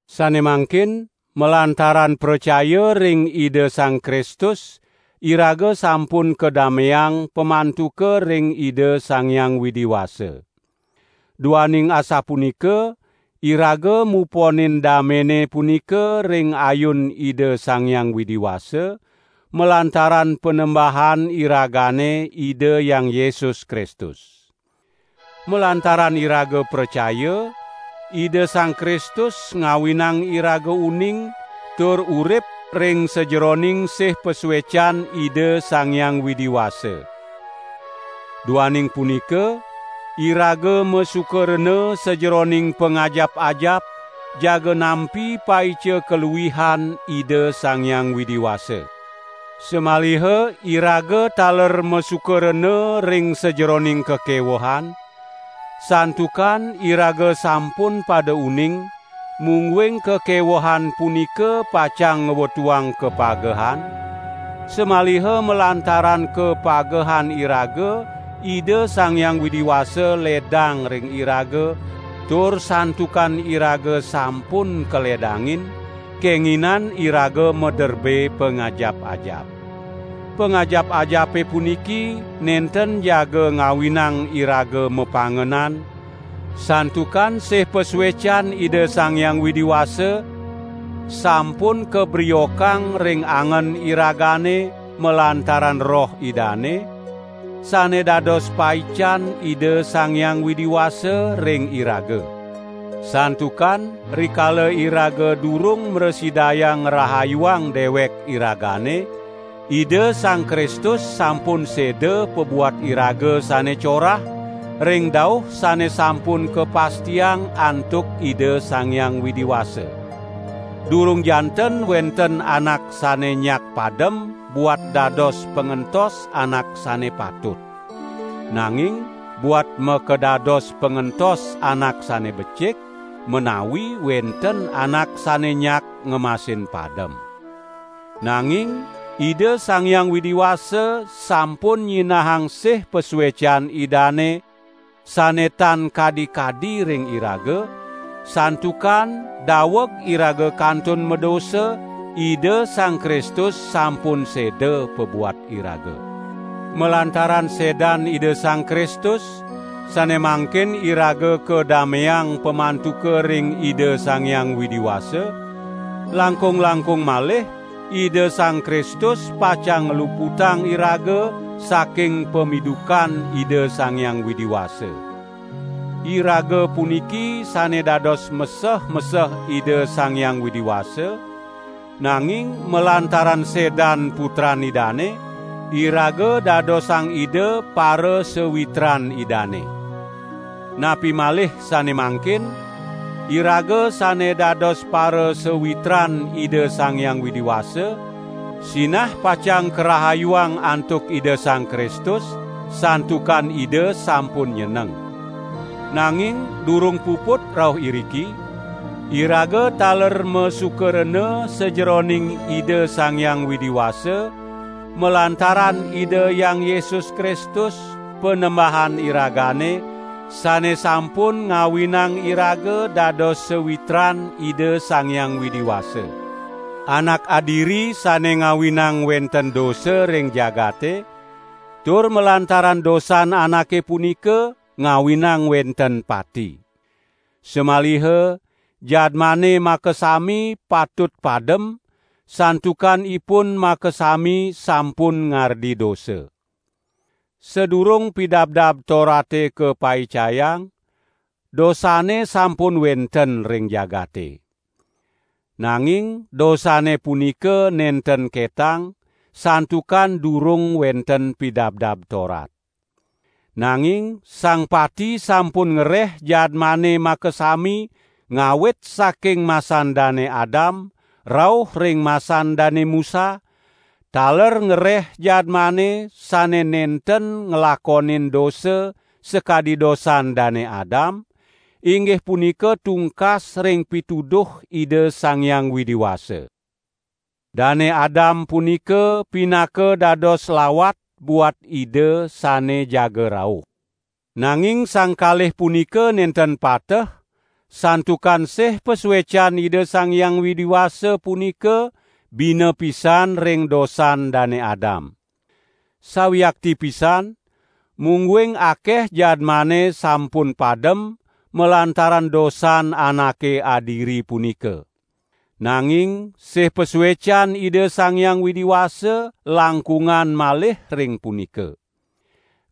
Sane mangkin malantaran pracaya ring Ida Sang Kristus iraga sampun kadameang pamantuka ring Ida Sang Hyang Widi Wasa. Duaning asapunika iraga muponin damene punika ring ayun Ida Sang Hyang Widi Wasa, malantaran Panembahan iragane Ida Hyang Yesus Kristus. Malantaran iraga pracaya, Ida Sang Kristus ngawinang iraga uning tur urip ring sajeroning sih pasuecan Ida Sang Hyang Widi Wasa. Duaning punika, iraga masuka rena sajeroning pangajap-ajap jaga nampi paica kaluihan Ida Sang Hyang Widi Wasa. Samaliha iraga taler masuka rena ring sajeroning kakewehan, santukan iraga sampun pada uning, mungguing kakewehan punika pacang ngwetuang kapagehan, samaliha malantaran kapagehan iraga Ida Sang Hyang Widi Wasa ledang ring iraga, tur santukan iraga sampun kaledangin, kenginan iraga maderbe pangajap-ajap. Pangajap-ajape puniki nenten jaga ngawinang iraga mapangenan, santukan sih pasuecan Ida Sang Hyang Widi Wasa sampun kabriokang ring angen iragane malantaran Roh Idane, sane dados paican Ida Sang Hyang Widi Wasa ring iraga. Santukan rikala iraga durung mrasidayang ngrahayuang dewek iragane, Ida Sang Kristus sampun seda pabuat iraga sane corah, ring dauh sane sampun kapastiang antuk Ida Sang Hyang Widi Wasa. Durung janten wenten anak sane nyak padem buat dados pangentos anak sane patut. Nanging buat makadados pangentos anak sane becik, menawi wenten anak sane nyak ngemasin padem. Nanging Ida Sang Hyang Widi Wasa sampun nyinahang sih pasuecan Idane sane tan kadi-kadi ring iraga, santukan daweg iraga kantun madosa Ida Sang Kristus sampun seda pabuat iraga. Malantaran sedan Ida Sang Kristus, sane mangkin iraga kadameang pamantuka ring Ida Sang Hyang Widi Wasa, langkung-langkung malih Ida Sang Kristus pacang ngluputang iraga saking pamidukan Ida Sang Hyang Widi Wasa. Iraga puniki sane dados meseh-meseh Ida Sang Hyang Widi Wasa, nanging malantaran sedan Putran Idane, iraga dadosang Ida parasawitran Idane. Napi malih sane mangkin, iraga sane dados parasawitran Ida Sang Hyang Widi Wasa, sinah pacang karahayuang antuk Ida Sang Kristus santukan Ida sampun nyeneng. Nanging durung puput rauh iriki; iraga taler masuka rena sajeroning Ida Sang Hyang Widi Wasa malantaran Ida Hyang Yesus Kristus, Panembahan iragane, sane sampun ngawinang iraga dados sawitran Ida Sang Hyang Widi Wasa. Anak adiri sane ngawinang wenten dosa ring jagate, tur malantaran dosan anake punika, ngawinang wenten pati. Samaliha jadmane makasami patut padem santukan ipun makasami sampun ngardi dosa. Sadurung Pidabdab Torate kapaicayang, dosane sampun wenten ring jagate. Nanging dosane punika nenten ketang, santukan durung wenten Pidabdab Torat. Nanging sang pati sampun ngereh jadmane makasami ngawit saking masan Dane Adam rauh ring masan Dane Musa, taler ngreh jadmane sane nenten nglakonin dosa sakadi dosan Dane Adam, inggih punika tungkas ring pituduh Ida Sang Hyang Widi Wasa. Dane Adam punika pinaka dados lawat buat Ida sane jaga rauh. Nanging sang kalih punika nenten pateh, santukan sih pasuecan Ida Sang Hyang Widi Wasa punika bina pisan ring dosan Dane Adam. Sawiakti pisan, mungguing akeh jadmane sampun padem malantaran dosan anake adiri punika. Nanging sih pasuecan Ida Sang Hyang Widi Wasa langkungan malih ring punika.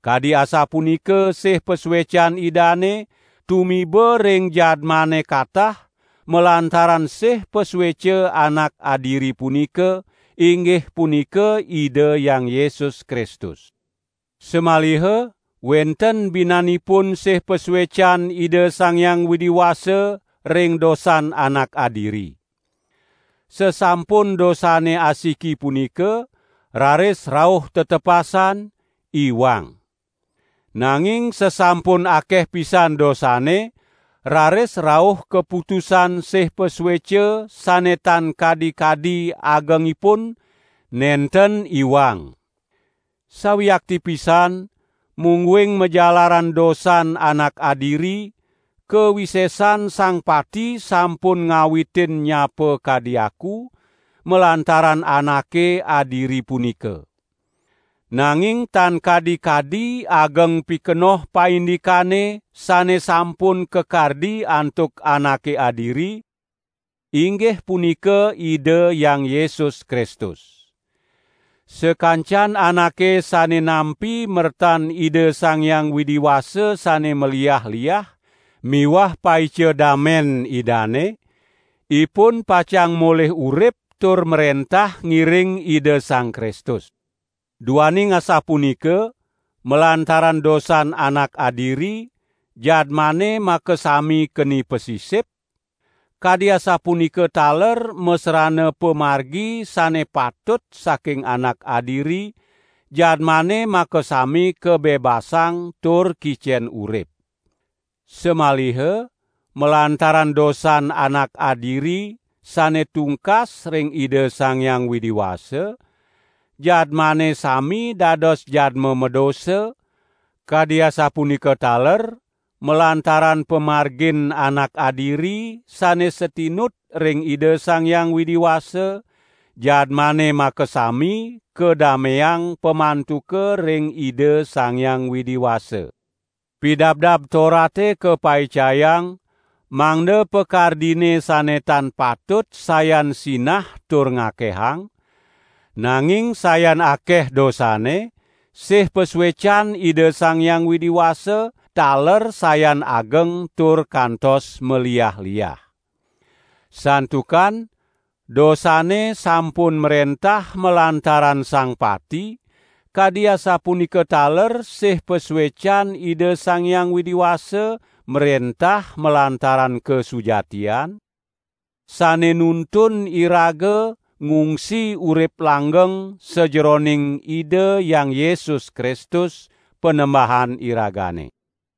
Kadi asapunika sih pasuecan Idane tumiba ring jadmane katah malantaran sih pasueca anak adiri punika, inggih punika Ida Hyang Yesus Kristus. Samaliha wenten binanipun sih pasuecan Ida Sang Hyang Widi Wasa ring dosan anak adiri. Sasampun dosane asiki punika, raris rauh tetepasan: "Iwang". Nanging sasampun akeh pisan dosane, raris rauh kaputusan sih pasueca sane tan kadi-kadi agengipun: "Nenten iwang". Sawiakti pisan mungguing majalaran dosan anak adiri, kawisesan sang pati sampun ngawitin nyapa kadi aku, malantaran anake adiri punika. Nanging tan kadi-kadi ageng pikenoh paindikane sane sampun kakardi antuk anake adiri, inggih punika Ida Hyang Yesus Kristus. Sakancan anake sane nampi mertan Ida Sang Hyang Widi Wasa sane maliah-liah miwah paica dame Idane, ipun pacang molih urip tur mrentah ngiring Ida Sang Kristus. Duaning asapunika, malantaran dosan anak adiri, jadmane makasami keni pasisip; kadi asapunika taler masrana pamargi sane patut saking anak adiri, jadmane makasami kabebasang tur kicen urip. Samaliha malantaran dosan anak adiri sane tungkas ring Ida Sang Hyang Widi Wasa, jadmane sami dados jadma madosa; kadi asapunika taler malantaran pamargin Anak adiri sane satinut ring Ida Sang Hyang Widi Wasa jadmane makasami kadameang pamantuka ring Ida Sang Hyang Widi Wasa. Pidabdab Torate kapaicayang, mangda pakardine sane tan patut sayan sinah tur ngakehang; nanging sayan akeh dosane, sih pasuecan Ida Sang Hyang Widi Wasa taler sayan ageng tur kantos maliah-liah. Santukan, dosane sampun mrentah malantaran sang pati, kadi asapunika taler sih pasuecan Ida Sang Hyang Widi Wasa mrentah malantaran kasujatian, sane nuntun iraga ngungsi urip langgeng sajeroning Ida Hyang Yesus Kristus, Panembahan iragane.